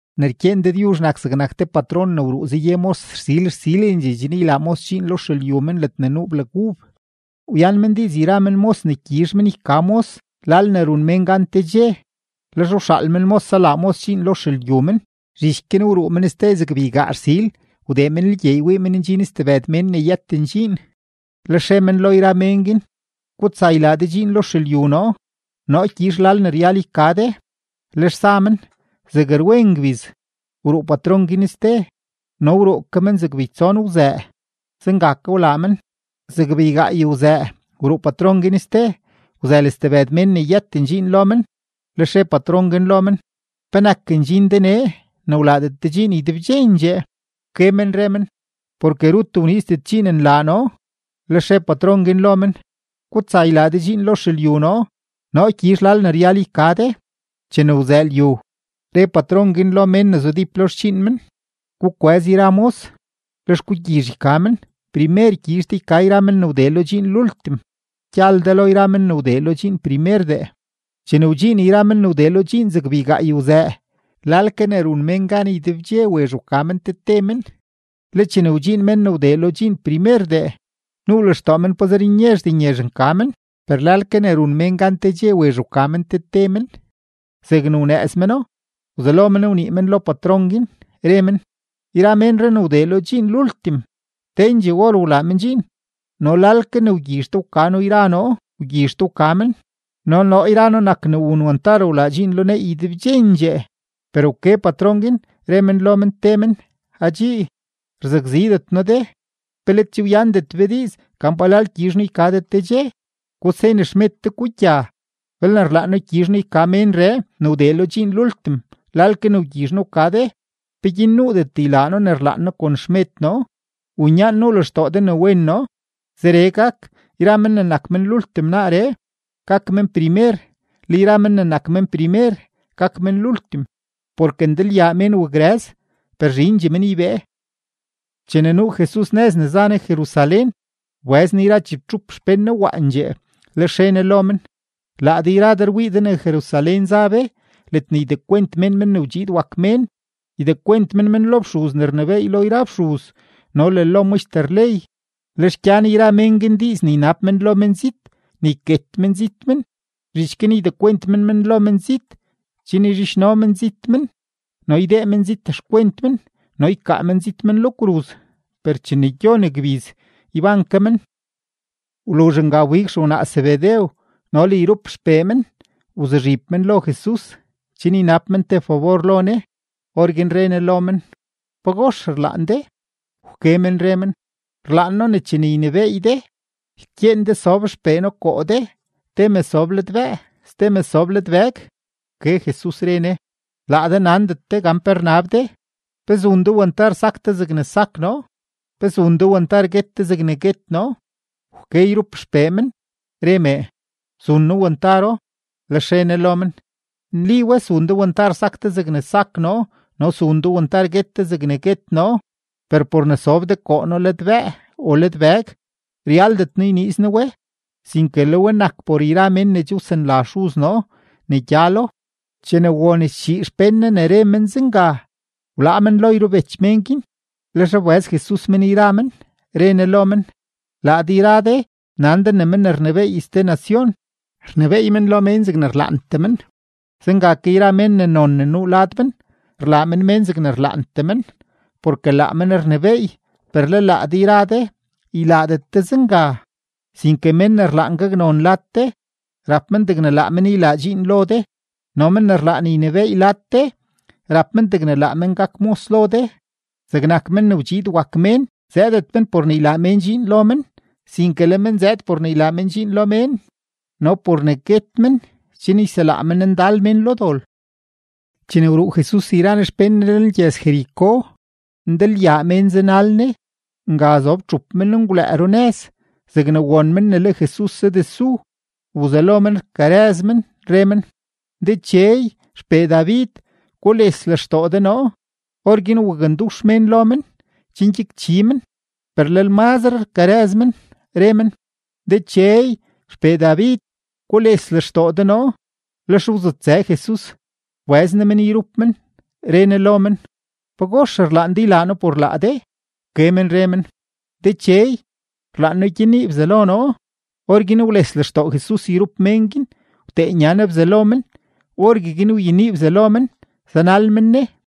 ’Ne rkyeen Dëdyuzh nak zegnak te patron ne wruu zaye mos rsil rsilendxee chen ylaa mos dxiin lo xelyu men ledne nuu blag ub. Wyan men diiz yra men mos ne gyizh men yka mos lal ne run mén gan te dxe; lex wxaal men mos zalaa mos dxiin lo xelyu men. Zhich guin wruu men ste zeg beygaa rsil, wdee men lgyeey wii men ndxin stebëd mén ne yëten dxiin. Lex re men lo yra men guin: “Gutsa ylaa de dxiin lo xelyu noo; noo gyizh lal ne ryal yka de.” Lex za men. Zeg rwen ngbiz, wruu patron guin ste no wruu ke men zeg beytson wzëë, zenga ke wlaa men. Zeg beygaay wzëë wruu patron guin ste; wzël stebëd mén ne yëten dxiin lo men, lex re patron guin lo men: “¿Penak ndxin de nee ne wlaadet de dxiin ydebdxendxee?” Wke men re men: “Porke rut wniizdet dxiin nlaa noo.” Lex re patron guin lo men: “Gutsa ylaa de dxiin lo xelyu noo; noo gyizh lal ne ryal yka de.” Chene wzëë lyu, re patron guin lo mén ne zudíp lo xdxiin men: “Gukwëz yra mos, lex gugyizh yka men, primer gyizh de yka yra men ne wdee lo dxiin lultim, gyal de lo yra men ne wdee lo dxiin primerdee.” Chene wdxiin yra men ne wdee lo dxiin zeg beygaay wzëë, lal ke ne run mén gan ydebdxe wezh wka men te te men. Le chene wdxiin men ne wdee lo dxiin primerdee, nuu lextoo men pazer nyezhdee nyezh nka men, per lal ke ne run mén gan te dxe wezh wka men te te men. Zegne wnëëz meno, wzelo men wnii men lo patron guin, re men: “Yra menree ne wdee lo dxiin lultim, tendxee or wlaa men dxiin, no lal ke ne wgyizh de wka noo yra noo wgyizh de wka men, no noo yra noo nak ne wun wantar wlaa dxiin lo neey ydebdxendxee.” Per wke patron guin, re men lo men te men: “Adxii, rzakzidet noo de. ¿Pe let che wyandet be diiz gan palal gyizh noo yka de te dxe? Gusen xmed de, gugya. Belne rlaan noo gyizh noo yka menree ne wdee lo dxiin lultim lal ke ne wgyizh noo wka de, ¿peguin nuudet ylaa noo ne rlaan noo kon xmed noo, u nyaan nuu lextoo de ne wen noo?” Zeree gak, yra men ne nak men lultim naaree, gak men primer; le yra men ne nak men primer, gak men lultim. Porke ndalyaa mén wakrëz, per zhindxee men ybee. Chene nuu Jesus nëz ne za Ne Jerusalén, wbëz Ne yra chibtxup xpén Ne waandxee, lex re Ne lo men: ―Laa de yra de rwii de ne Jerusalén za be ledne ydekwent mén Men ne wdxiid wak Mén; ydekwent men men lo fxuz ne rnebééy lo yra fxuz no le lo maxter ley, lex gyan yra mén guin diiz ne ynab men lo menzit ne yket menzit men; zhich guin ydekwent men men lo menzit chen yzhidxno menzit men, no ydee menzit xkwent men no ykaa menzit men lo kruz; per chene gyon gbiz, yban ke men. Wluzh nga wbig xewnaa Zebedew no le yrup xpee men wzuzhib men lo Jesus chen ynab men te fabor lo Ne. Orguin re Ne lo men: ―¿Pagox rlaan de? Wke men re men: ―Rlaan noo ne chene ynebééy de, ykyeen de sob xpee noo koo de, te me sob ladbëë, ste me sob ladbëg. Wke Jesus, re Ne: ―Laa de nandet de gan pe rnab de. ¿Pe zun de wantar sak de zegne sak noo? ¿Pe zun de wantar guet de zegne guet noo? Wke yrup xpee men, re mee: ―Zun noo wantaro. Lex re Ne lo men: ―Nli we, zun de wantar sak de zegne sak noo no zun de wantar guet de zegne guet noo, per por ne sob de koo noo ladbëë o ladbëg, ryaldet noo yniiz noo we, sinke le we nak por yra mén ne che wsanla Xuz noo ne gyalo. Chene won schii xpén Ne ne re men zenga, wlaa men lo yrubech men guin. Lex wbëz Jesus men yra men, re Ne lo men: ―Laa de yra de nan de ne men ne rnebééy ste nacion, rnebééy men lo mén zegne rlaantee men; zenga ke yra mén ne non ne nuu lad men, rlaa men mén zegne rlaantee men, porke laa men rnebééy. Per le laa de yra de ylaadet de zenga. Sinke men ne rlaan gaknon lad de, rap men degne laa men ylaa dxiin lo de. No men ne rlaan ynebééy lad de, rap men degne laa men gak mos lo de. Zegnak Men ne wdxiid wak Mén zëëdet men por ne ylaa mén dxiin lo men, sinke le men zëëd por ne ylaa men dxiin lo mén no por ne guet men chen yselaa men ndal mén lo dol. Chene wruu Jesus yra Ne xpén Ne lenlgyëz-Jericó, ndalyaa mén za zanal Ne. Nga zob txup menngwlëë runëz; zegne won men ne le Jesus zadesu, wzelo men rkarëz men, re men: ―¡Dechey, XPee David, gules lextoo de noo! Orguin wakndux mén lo men chen gyakchi men, per lel mazre rkarëz men, re men: ―¡Dechey, XPee David, gules lextoo de noo! Lex wzutsë Jesus, wbëz Ne men yrup men, re Ne lo men: ―¿Pagox rlaan de ylaa noo por laa de? Wke men re men: ―Dechey, rlaan noo gyenii bzalo noo. Orguin wles lextoo Jesus yrup mén guin, wtee nya Ne bzalo men. Orgueguin wyenii bzalo men, zanal men Ne.